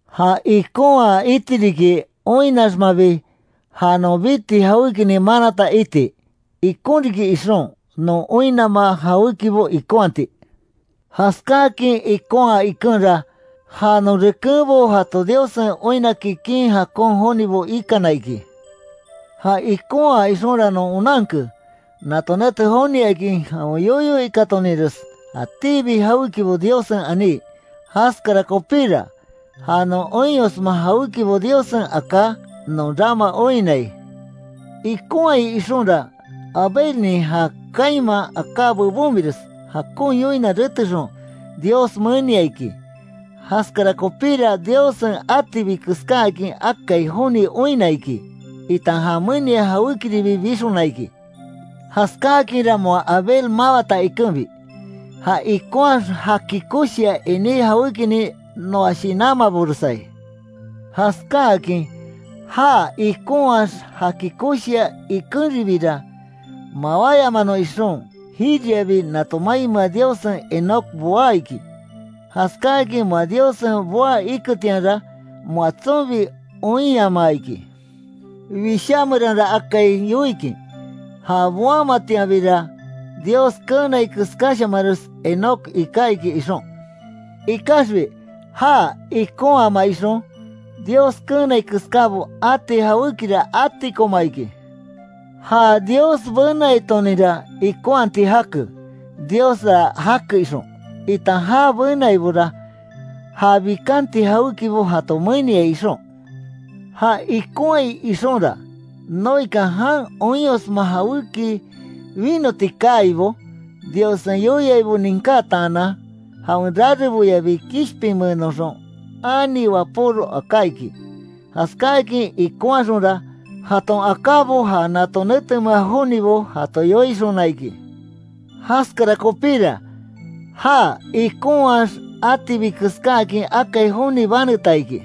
Ja ikonhaa iti riki, oinnaxmabi, ja non biti jawékinin manata iti. Ikon riki ixon, non oinnama jawékibo ikonhati. Jaskáakin ikonhaa ikenra, ja non rekenbo jato Diossen oinna kikin jakon jonibo ikana iki. Ja ikonhaa ixonra non onanke, nato nete joniakin, jawen yoyo ikatoninres jatíbi jawékibo Diossen aní. Jaskara kopíra, ja non oinyosma jawékibo Diossen aká, non rama oinnai. Ikonhai ixonra, Abelnin ja Caínman aká bebonres, jakon yoina retexon, Dios menia iki. Jaskara kopíra, Diossen atibi keskáakin akai joni oinna iki, itan jan menia jawékiribi bixona iki. Jaskáakinra moa Abel mawata ikenbi, ja ikonhaax jaki koshia iní jawékinin noa shinanmaboresai. Jaskáakin já ikonhaax jaki koshia ikenribira, mawáyamanon ixon, jiriabi nato mainmea Diossen Enoc boá iki, jaskáakin moa Diossen boa iketianra, moa tsonbi oinyamaa iki. Wishá meranra akai yoikin, ja boamatianbira Dios keenai keskáshamanres Enoc iká iki ixon. Ikaxbi já ikonhama ixon, Dios keenai keskábo ati jawékira atikoma iki. Ja Dios benaitoninra ikonhati jake, Diosra jake ixon, itan já benaibora, ja bikanti jawékibo jato meniai ixon. Ja ikonhai ixonra, Noekan jan oinyosma jawéki winoti kaaibo, Diossen yoiaibo ninkátaanan, jawen rareboyabi kishpinmeenoxon, ani wapóro aká iki. Jaskáakin ikonhaxonra, jaton akábo ja nato netenmea jonibo jato yoixona iki. Jaskara kopíra, já ikonhaax, atibi keskáakin akai joni baneta iki.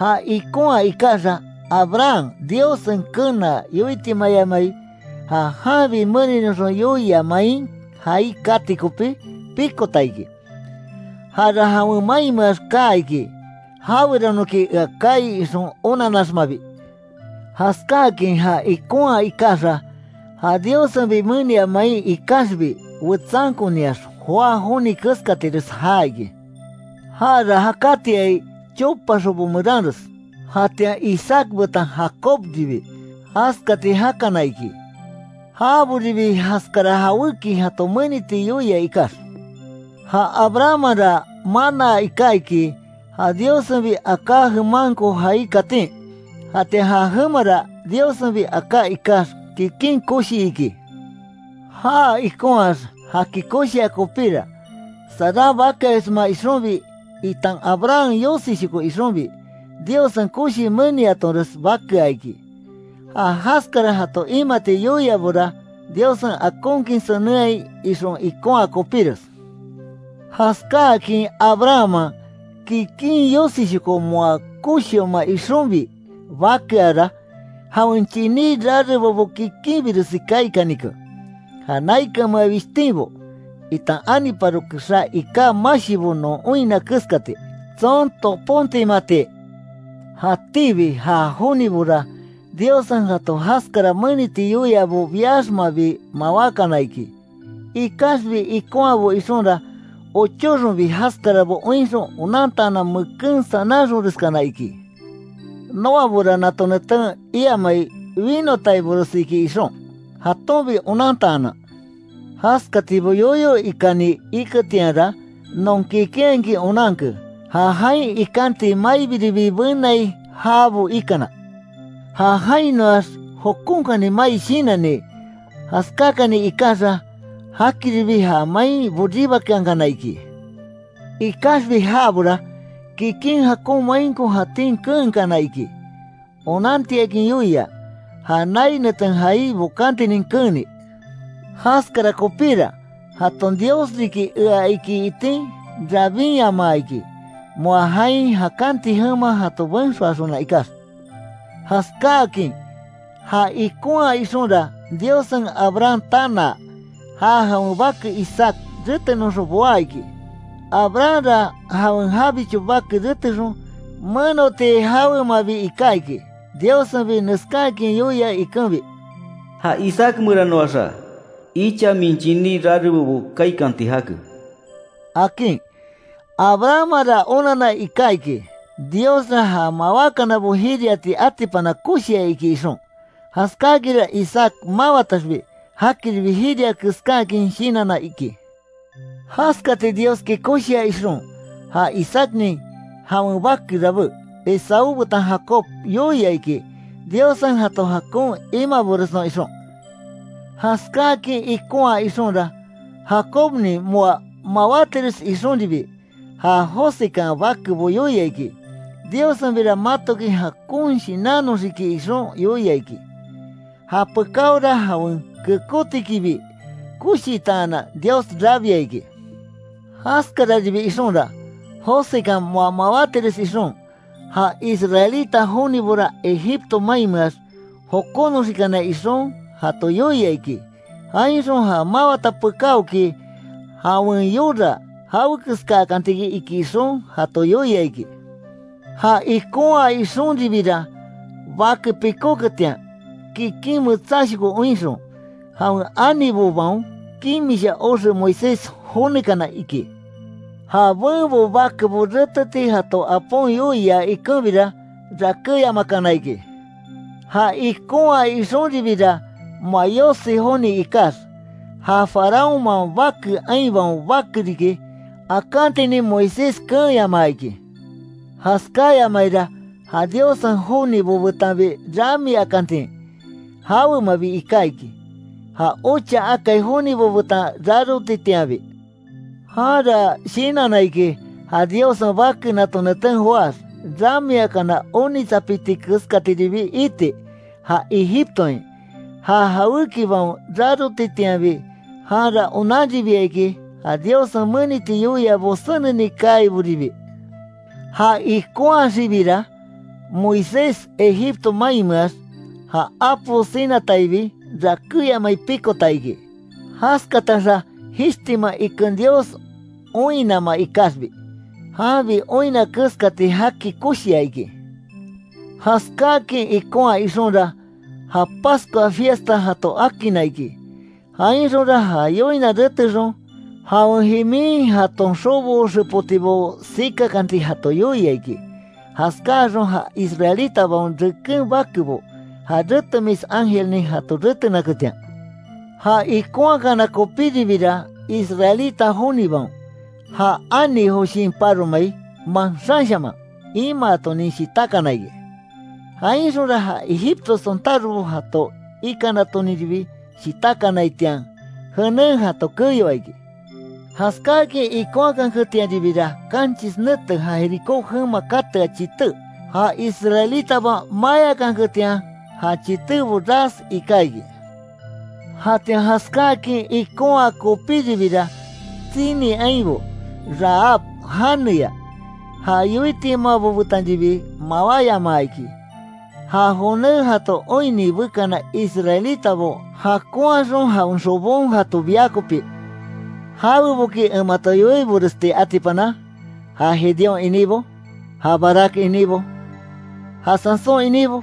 Já ikonhaa ikaxa, Abraham Diossen kenaa, yoitimayamai ja janbi meninoxon yoia main jaai kati kopí, pikota iki. Jara jawen mainmeax kaa iki, jaweranoki, ea kaai ixon onannaxmabi. Jaskáakin já ikonhaa ikaxa, ja Diossenbi menia main ikaxbi wetsankoniax joá joni keskatires jaa iki. Jara jakatiai, chopa xobo meranres. Jatian Isaac betan Jacobribi jaskati jakana iki, jaboribi jaskara jawéki jato meniti yoia ikax. Ja Abrahammanra manaa iká iki, ja Diossenbi aká jemanko jaai katín. Jatian ja jemara, Diossenbi aká ikax, kikin koshi iki. Já ikonhaax jaki koshia kopíra, Saran bakeayosma ixonbi, itan Abraham yosishoko ixonbi. Diossen koshi meniatonres bakea iki. Ja jaskara jato imati yoiabora, Diossen akonkin senenhai ixon ikonha kopíres. Jaskáakin Abrahamman, kikin yosishoko moa koshioma ixonbi bakeara, jawen chiní rarebobo kikinbiresi kaikanike. Ja naikanmea wishtinbo, itan aniparo kexá iká mashibo non oinna keskati, tson toponmati. Jatíbi ja jonibora, Diossen jato jaskara meniti yoiabo biaxmabi mawákana iki, ikaxbi ikonhabo ixonra, ochóxonbi jaskarabo oinxon onantaanan, meken sananxonreskana iki. Noabora nato netén iamai winotaibores iki ixon, jatonbi onantaanan. Jaskatibo yoyo ikáni iketianra, non kikinhakin onanke, ja jain ikanti maibiribi benai jabo ikana. Ja jainoax jokonkani mai shinanni jaskakani ikaxa, jakiribi ja main boribakeankana iki. Ikaxbi jabora, kikin jakon mainko jatín keenkana iki. Onantiakin yoia, ja nai neten jaai bokantinin keeni. Jaskara kopíra, jaton Dios riki ea iki itin, rabinyamaa iki, moa jain jakanti jema jato benxoaxona ikax. Jaskáakin já ikonhaa ixonra, Diossen Abraham tanaa, ja jawen bake Isaac retenoxon boá iki, Abrahamra jawen jabicho bake retexon, menoti jawemabi iká iki, Diossenbi neskaakin yoia ikenbi: “Ja Isaac meranoaxa, icha min chiní rarebobo kaikanti jake”, akin. Abrahammanra onanna iká iki, Diosra ja mawákanabo jiriati atipana koshia iki ixon. Jaskáakinra Isaac mawataxbi, jakiribi jiria keskáakin shinanna iki. Jaskati Dioski koshia ixon, ja Isaacnin jawen bake rabé, Esaú betan Jacob yoia iki, Diossen jato jakon imaboresnon ixon. Jaskáakin ikonhaa ixonra, Jacobnin moa mawátires ixonribi, ja Josekan bakebo yoia iki, Diossenbira matoki jakon shinannoxiki ixon yoia iki. Japekaora jawen kekótikibi koshitaanan, Dios rabia iki. Jaskararibi ixonra, Josekan moa mawátires ixon, ja israelita jonibora Egipto mainmeax jokonoxikanai ixon, jato yoia iki, jainxon ja mawata pekáoki, jawen yora jawekeskakanti iki ixon, jato yoia iki. Ja ikonhaa ixonribira, bake pikóketian, kikin metsáshoko oinxon, jawen anibobaon kimisha oxe Moisés jonekana iki. Ja benbo bakebo reteti jato apon yoia ikenbira, rakéyamakana iki. Ja ikonhaa ixonribira, moa yosi joni ikax, ja faraónman bake ainbaon bake riki, akantinin Moisés keenyamaa iki. Jaskáyamaira, ja Diossen jonibo betanbi ramiakantin, jawemabi iká iki, ja ocha akai jonibo betan rarotitianbi. Janra shinanna iki, ja Diossen Bake nato neten joáx, ramiakana onitsapiti keskatiribi iti. Ja Egiptoain ja jawékibaon rarotitianbi; janra onanribia iki, ja Diossen meniti yoiabo seneni kaiboribi. Ja ikonhaxibira, Moisés Egipto mainmeax, ja apo sinataibi, rakéyamai pikota iki, jaskataxa jishtima iken Dios oinnama ikaxbi, janbi oinna keskati jaki koshia iki. Jaskáakin ikonhaa ixonra, ja Pascua fiesta jato akinna iki. Jainxonra ja yoina retexon, jawen jimin jaton xobo xepotibo sikakanti jato yoia iki, jaskáxon ja israelitabaon reken bakebo, ja retemis ángelnin jato retenaketian. Ja ikonhakana kopíribira, israelita jonibaon, ja ani Joshin paro mai manxanshaman imaatonin shitákana iki. Jainxonra ja Egipto sontárobo jato ikanatonribi shitákanaitian, jenen jato keyoa iki. Jaskáakin ikonhakanketianribira, kanchis nete ja Jericó jema katea chité, ja israelitabaon mayákanketian, ja chitébo ras ika iki. Jatian jaskáakin ikonhaa kopíribira, tsini ainbo, Rahab janeya, ja yoitimabo betanribi mawáyamaa iki. Ja joné jato oinni bekana israelitabo jakonhaxon jawen xobon jato bia kopí. ¿Jaweboki en mato yoiboresti atipana? Ja Gedeón iníbo, ja Barac iníbo, ja Sansón iníbo,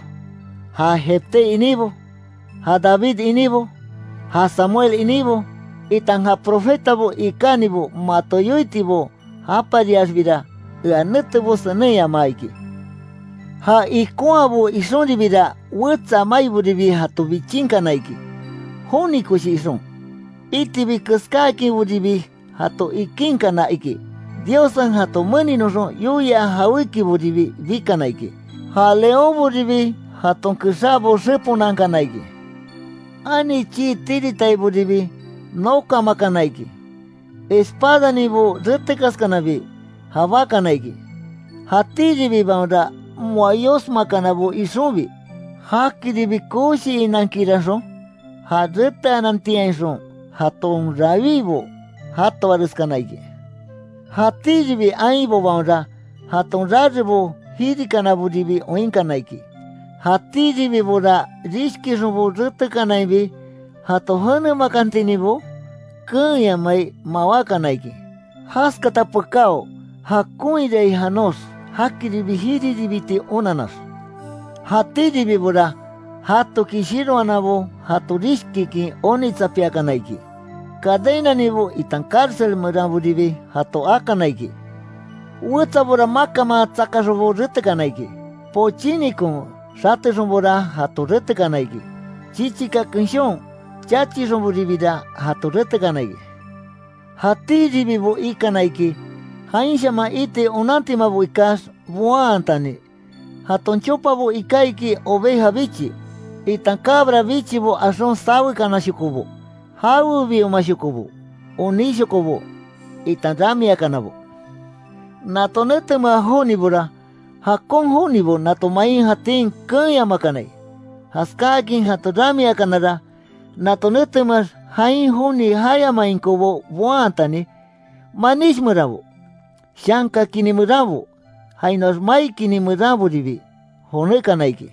ja Jefté iníbo, ja David iníbo, ja Samuel iníbo, itan ja profetabo ikánibo mato yoitibo japariaxbira, ea netebo senenyamaa iki. Ja ikonhaabo ixonribira wetsa maiboribi jato bichinkana iki, joni koshi ixon, itibi keskáakinboribi jato ikínkana iki, Diossen jato meninoxon yoia jawékiboribi bikana iki, ja leónboribi jaton kexabo xeponankana iki. Ani chii tiritaiboribi nokamakana iki, espadaninbo retekaskanabi, jabákana iki, jatíribibaonra moa yosmakanabo ixonbi, jakiribi koshiinakiranxon, ja reteanantiainxon jaton rawíbo jatoareskana iki. Jatíribi ainbobaonra, jaton rarebo jirikanaboribi oinkana iki. Jatíribibora rishkixonbo retekanainbi jato jenemakantininbo keenyamai mawákana iki, jaskata pekáo jakonhirai janox jakiribi jiribiti onannax. Jatíribibora jatoki shiroananbo jato rishkikin, onitsapiakana, iki, cadenaninbo, itan cárcel meranboribi jato akana iki. Wetsabora makanman tsakaxonbo retekana iki, pochínikon xatexonbora, jato retekana iki, chichika kenshon chachixonboribira jato retekana iki. Jatíribibo ikana iki, jainshaman iti onantimabo ikax, boantani, jaton chopabo iká iki oveja bichi, itan cabra bichibo axon sawekanashokobo, jawebiomashokobo, onísshokobo, itan ramiakanabo. Nato netemea jonibora, jakon jonibo nato main jatín keenyamakanai, jaskákin jato ramiakanara, nato netemeax jain joni jayamainkobo boantani, manish meranbo, shanka kini meranbo, jainoax mai kini meranboribi, jonékana iki.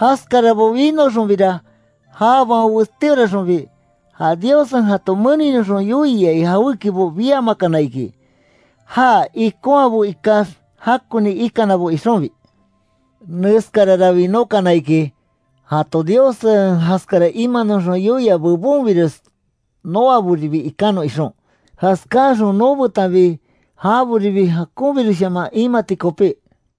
Jaskarabo winoxonbira jabaon westíoraxonbi, ja Diossen jato meninoxon yoiai jawékibo biamakana iki. Já ikonhaabo ikax jakoni ikanabo ixonbi. Neskarara winókana iki, jato Diossen jaskara imanoxon yoia bebonbires noaboribi ikanon ixon. Jaskáaxon nobetanbi, jaboribi jakonbiresshaman imati kopí.